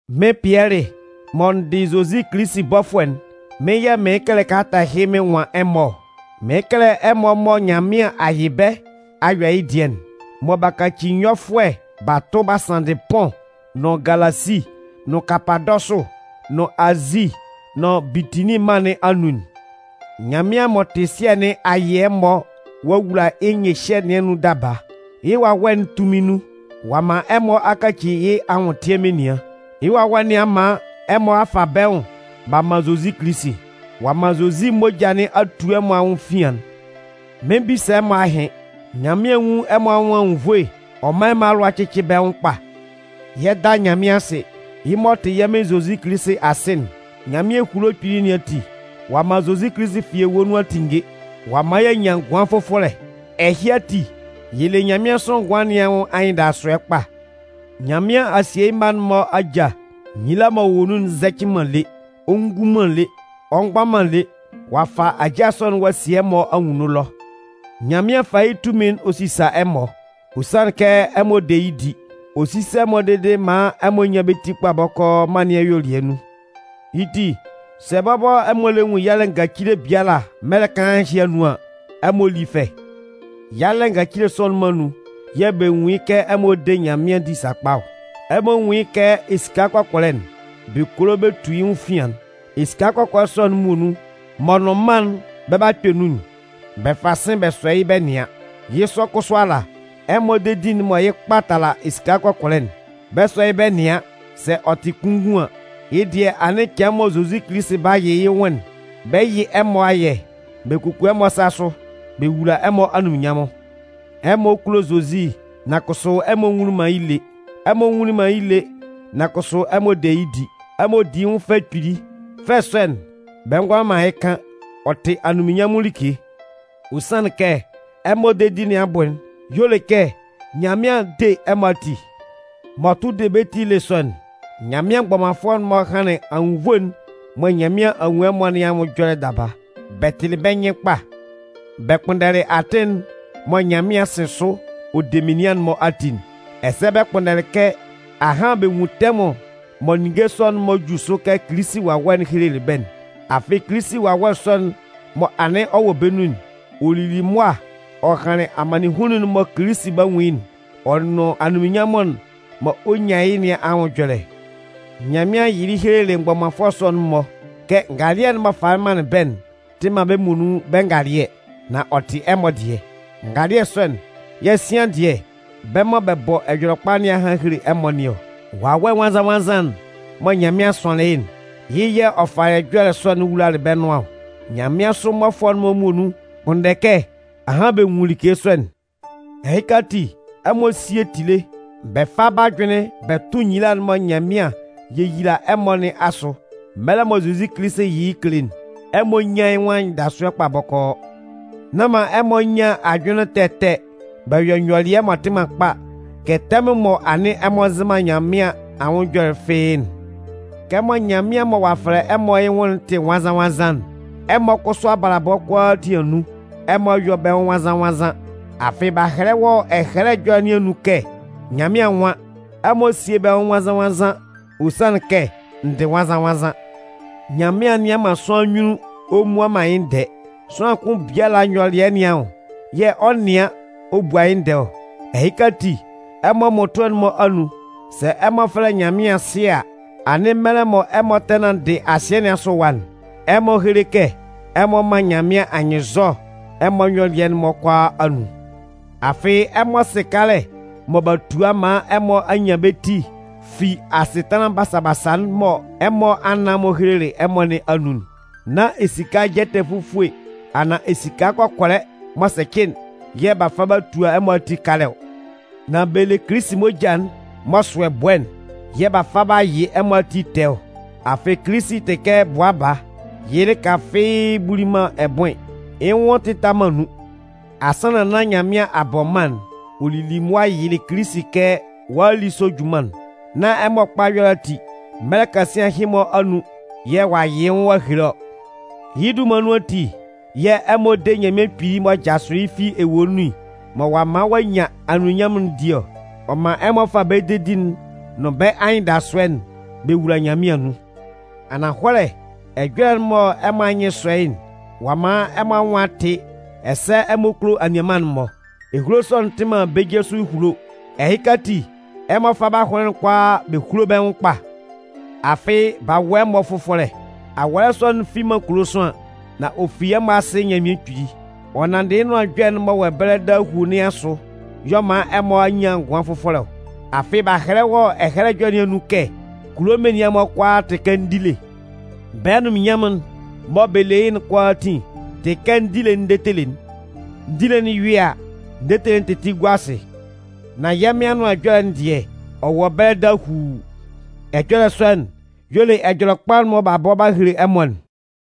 Mɩ́n Pɩɛlɩ, mɔ n dɩ Zozi Kilisi bɔfʋɛ'n, mɩ́n yɛ̂ mɩɩn kɛlɛ kalata ɛhɩ mɩn nwan ɛmɔ ɔ. Mɩɩn kɛlɛ ɛmɔ mɔ Nyanmɩan a yɩ bɛ́ a yɔ yɩ́ dɩɛ'n, mɔ b'a kaci nyɔfʋɛ b'a tʋ b'a sanndɩ Pʋn, nʋn Galasi, nʋn Kapadɔsʋ, nʋn Azi nʋn Bitinin mân nɩn anun'n. Nyanmɩan m'ɔ tɩ Sɩɛ nɩn a yɩ ɛmɔ ɔ'a wula yɩ́ nyɩhyɛ nɩn anun daba. Yɩ́ Wawɛ'n tunmin nun, ɔ'a man ɛmɔ a kaci yɩ́ anwʋntɩɛ menian. Yɩ́ Wawɛ nɩn a man ɛmɔ a fa bɛ́ nwʋn b'a man Zozi Kilisi. Ɔ'a man Zozi moja nɩn a tu ɛmɔ anwʋn efian'n. Mɩn 'bisa ɛmɔ ahɩn. Nyanmɩan nwún ɛmɔ anwʋn anwunnvoe ɔ mán ɛmɔ alʋa cɩ́cɩ bɛ́ nwʋn kpa. Yɛ 'da Nyanmɩan asɩ, yɩ́ m'ɔ tɩ yɛ́ Mɩn Zozi Kilisi Asɩ'n. Nyanmɩan ehulo kpili nɩn ati, ɔ'a man Zozi Kilisi fi ewue nun a tinnge ɔ'a man y'a nyan ngʋan fʋfɔlɛ. Ɛhɩ ati, yɛ le nyanmɩansʋ ngʋan nɩn anwʋn anyɩndasʋɛ kpa. Nyanmɩan a sie yɩ́ mma'n-mɔ ajâ. Nyila'n m'ɔ wɔ nun'n nzɛcɩ man lé, ɔ ngun man lé, ɔ mgba man lé. Ɔ'a fa ajâ sɔ'n ɔ'a sie ɛmɔ anwunno ɛlɔ. Nyanmɩan fa yɩ́ tunmin'n ɔ sisa ɛmɔ. Ɔ sanlɩn kɛ ɛmɔ de yɩ́ di. Ɔ 'sisa ɛmɔ dede maan ɛmɔ nyan bɛ́ ti kpa bɔkɔɔ mân nɩn ayuelɩɛ nun. Yɩ́ ti, sɛ bɔbɔ ɛmɔ lɛ nwun yalɛ ngacile biala mɛlɛ kaan ɛhɩ anun an, ɛmɔ lí fɛ. Yalɛ ngacile sɔ'n-mɔ anun yɛ̂ bɛ nwun yɩ́ kɛ ɛmɔ de Nyanmɩan di sakpa ɔ. Ɛmɔ nwún yɩ́ kɛ esika kɔkɔlɛ'n, bɛ kolo bɛ tu yɩ́ nwʋn efian'n. Esika kɔkɔlɛ sɔ'n muonun m'ɔ nʋn mân'n bɛ 'ba kpɛ nun'n, bɛ fa sɩ̂n bɛ sɔ yɩ́ bɛ nɩan. Yɩ́ sɔ kʋsʋ ala, ɛmɔ dedi'n mɔ yɩ́ kpa tala esika kɔkɔlɛ'n, bɛ 'sɔ yɩ́ bɛ nɩan sɛ ɔ tɩ kunngun an. Yɩ́ dɩɛ anɩn cɩan mɔ Zozi Kilisi 'ba yɩ yɩ́ nwʋn'n, bɛ 'yɩ ɛmɔ ayɛ, bɛ kuku ɛmɔ asa sʋ, bɛ wula ɛmɔ anunminnyanmʋn. Ɛmɔ kulo Zozi nan kʋsʋ ɛmɔ nwunlin man yɩ́ nyunnun lé. Ɛmɔ nwunlin man yɩ́ nyunnun lé, nan kʋsʋ ɛmɔ de yɩ́ di. Ɛmɔ di yɩ́ nwʋn fɛ kpili. Fɛ sɔ'n, bɛ ngʋala man yɩ́ kan, ɔ tɩ anunminnyanmʋn like. Ɔ sanlɩn kɛ ɛmɔ dedi nɩn abʋ'n y'ɔ le kɛ Nyanmɩan 'de ɛmɔ ati. M'ɔ tʋ de bɛ́ ti ele sɔ'n, Nyanmɩan mgbɔmanfʋɛ'n-mɔ hanlɩn anwunnvoe'n mɔ Nyanmɩan a nwun ɛmɔ nɩn anwʋn ɛjɔlɛ daba. Bɛ tɩlɩ bɛ́ nyɩn kpa bɛ kpʋnndɛlɩ atɩn'n mɔ Nyanmɩan 'sɩn sʋ ɔ de menian'n-mɔ ati'n, ɛsɛ bɛ kpʋnndɛlɩ kɛ ahan bɛ nwun tɛmʋn mɔ ninnge sɔ'n-mɔ 'ju sʋ kɛ Kilisi Wawɛ'n helelɩ bɛ́'n. Afɩ Kilisi Wawɛ sɔ'n mɔ anɩn ɔ wɔ bɛ́ nun'n, ɔ lili mʋa ɔ hanlɩn amannɩnhunnun'n mɔ Kilisi 'ba nwun yɩ́'n, ɔ nʋn anunminnyanmʋn'n mɔ ɔ 'nyan yɩ́ nɩn anwʋn ɛjɔlɛ. Nyanmɩan yɩlɩ helelɩ mgbɔmanfʋɛ sɔ'n-mɔ kɛ ngalɩɛ'n m'ɔ falɩ manlɩn bɛ́'n tɩ man bɛ́ muonun bɛ́ ngalɩɛ, nan ɔ tɩ ɛmɔ dɩɛ. Ngalɩɛ sɔ'n yɛ̂ sian dɩɛ bɛ́ mɔ bɛ bɔ Ɛjɔlɛkpa nɩn a han a hele ɛmɔ nɩn ɔ. Wawɛ Nwannzan-nwannzan'n mɔ Nyanmɩan sʋanlɩn yɩ́'n, yɩ́ yɛ̂ ɔ falɩ ɛjɔlɛ sɔ'n wulalɩ bɛ́ nʋan ɔ. Nyanmɩansʋ mmɔfʋɛ'n-mɔ muonun kpʋnndɛ kɛ ahan bɛ nwun like sɔ'n. Ɛhɩka ati, ɛmɔ síe tile, bɛ fá bɛ́ ajʋnlɩn bɛ tʋ́ nyila'n mɔ Nyanmɩan 'yeyila ɛmɔ nɩn asʋ mɛlɛ mɔ Zozi Kilisi 'yɩ yɩ́ kele'n. Ɛmɔ nyán yɩ́ nwʋn anyɩndasʋɛ kpa bɔkɔɔ. Ɛmɔ mán bɛ́ nyɩn sɔ́ Nyanmɩan. Nán man ɛmɔ nyan ajʋnlɩn ɛtɛ ɛtɛ bɛ yɔ nyɔlɩɛ m'ɔ tɩ man kpa kɛ tɛmʋn mɔ anɩn ɛmɔ nzɩ man Nyanmɩan anwʋn ɛjɔlɛ'n fɩ́ɩ́'n. Kɛmɔ Nyanmɩan mɔ ɔ'a fɛlɛ ɛmɔ yɩ́ nwʋn'n tɩ nwannzan-nwannzan'n, ɛmɔ kʋsʋ abalabɔ kʋalaatin anun, ɛmɔ yɔ́ bɛ́ nwʋn nwannzan-nwannzan. Afɩ b'a hɛlɛ wɔ Ɛhɛlɛ Ɛjɔlɛ nɩn anun kɛ Nyanmɩan nwan: Ɛmɔ síe bɛ́ nwʋn nwannzan-nwannzan, ɔ sanlɩn kɛ n dɩ nwannzan-nwannzan. Nyanmɩan nnɩan man sʋanlan nyunnun ɔ mmua man yɩ́ ndɛɛ. Sʋanlan kʋn biala nyɔlɩɛ nɩn anwʋn yɛ̂ ɔ 'nɩan ɔ bua yɩ́ ndɛɛ ɔ. Ɛhɩka ati, ɛmɔ mmʋtʋɛ'n-mɔ anun, sɛ ɛmɔ fɛlɛ Nyanmɩan Sɩɛ a, anɩn mɛlɛ mɔ ɛmɔ tɛ nanndɩ asɩɛ nɩn asʋ ɛwa'n, ɛmɔ héle kɛ ɛmɔ man Nyanmɩan anyɩnnzɔ ɛmɔ nyɔlɩɛ'n-mɔ kʋalaa anun. Afɩ ɛmɔ sɩ kalɛ mɔ b'a tua maan ɛmɔ a nyan bɛ́ ti fi asɩtanlan basa-basa'n mɔ ɛmɔ anan-mɔ helelɩ ɛmɔ nɩn anun'n. Nán esika jɛtɛ fufue anaan esika kɔkɔlɛ m'ɔ sɛcɩ'n yɛ̂ b'a fa b'a tua ɛmɔ ati kalɛ ɔ. Nan bɛ le Kilisi moja'n m'ɔ sʋ ɛbʋɛ'n yɛ̂ b'a fa b'a yɩ ɛmɔ ati tɛɛ ɔ. Afɩ Kilisi tɩ kɛ bʋa baa, yɩ́ lɩka fɩ́ɩ́ buli man ɛbʋɩn, yɩ́ nwʋn tɩta man nun. Asannan nán Nyanmɩan a bɔ mân'n, ɔ lili mʋa yɩlɩ Kilisi kɛ ɔ'a a li sɔ junman'n. Nán ɛmɔ kpa ɛyɔlɛ ati, mɛlɛ kasian ɛhɩ-mɔ anun yɛ̂ ɔ'a yɩ yɩ́ nwʋn ɔ'a hele ɔ. Yɩ́ dunman nun ati yɛ̂ ɛmɔ de Nyanmɩan Kpili m'ɔ jasʋlɩ yɩ́ fi ewue nun, mɔ ɔ'a man ɔ'a nyan anunminnyanmʋn'n di ɔ. Ɔ man ɛmɔ fa bɛ́ dedi'n nʋn bɛ́ anyɩndasʋɛ'n bɛ wula Nyanmɩan anun. Ananhɔlɛ ɛjɔlɛ'n mɔ ɛmɔ anyɩn sɔ yɩ́'n, ɔ'a man ɛmɔ anwʋn a tɩ ɛsɛ ɛmɔ kulo anianman'n-mɔ. Ehulo sɔ'n tɩ man bɛ́ je sʋ ehulo. Ɛhɩka ati, ɛmɔ fá bɛ́ ahʋnlɩn'n kʋalaa bɛ húlo bɛ́ nwʋn kpa. Afɩ b'a wʋ ɛmɔ fʋfɔlɛ. Awɔlɛ sɔ'n fi man kulo sʋanlan, nan ɔ fi ɛmɔ Asɩ Nyanmɩan Kpili. Ɔ nanndɩ yɩ́ Nʋan Ɛjɔlɛ'n m'ɔ wɔ ɛbɛlɛ dahuu nɩn asʋ y'ɔ man ɛmɔ a nyan ngʋan fʋfɔlɛ ɔ. Afɩ b'a hɛlɛ wɔ Ɛhɛlɛ Ɛjɔlɛ nɩn anun kɛ: Kulo menian'n-mɔ kʋalaa tɩ kɛ ndile. Bɛ́ anunminnyanmʋn'n mɔ bɛ le yɩ́'n kʋalaatin tɩ kɛ ndile'n ndetele'n. Ndile'n yʋɩ a, ndetele'n tɩtɩ gua asɩ. Nan yɛ́ Mɩn Anʋan Ɛjɔlɛ'n dɩɛ, Ɔ wɔ ɛbɛlɛ dahuu. Ɛjɔlɛ sɔ'n, y'ɔ le Ɛjɔlɛkpa'n mɔ b'a bɔ b'a hele ɛmɔ'n.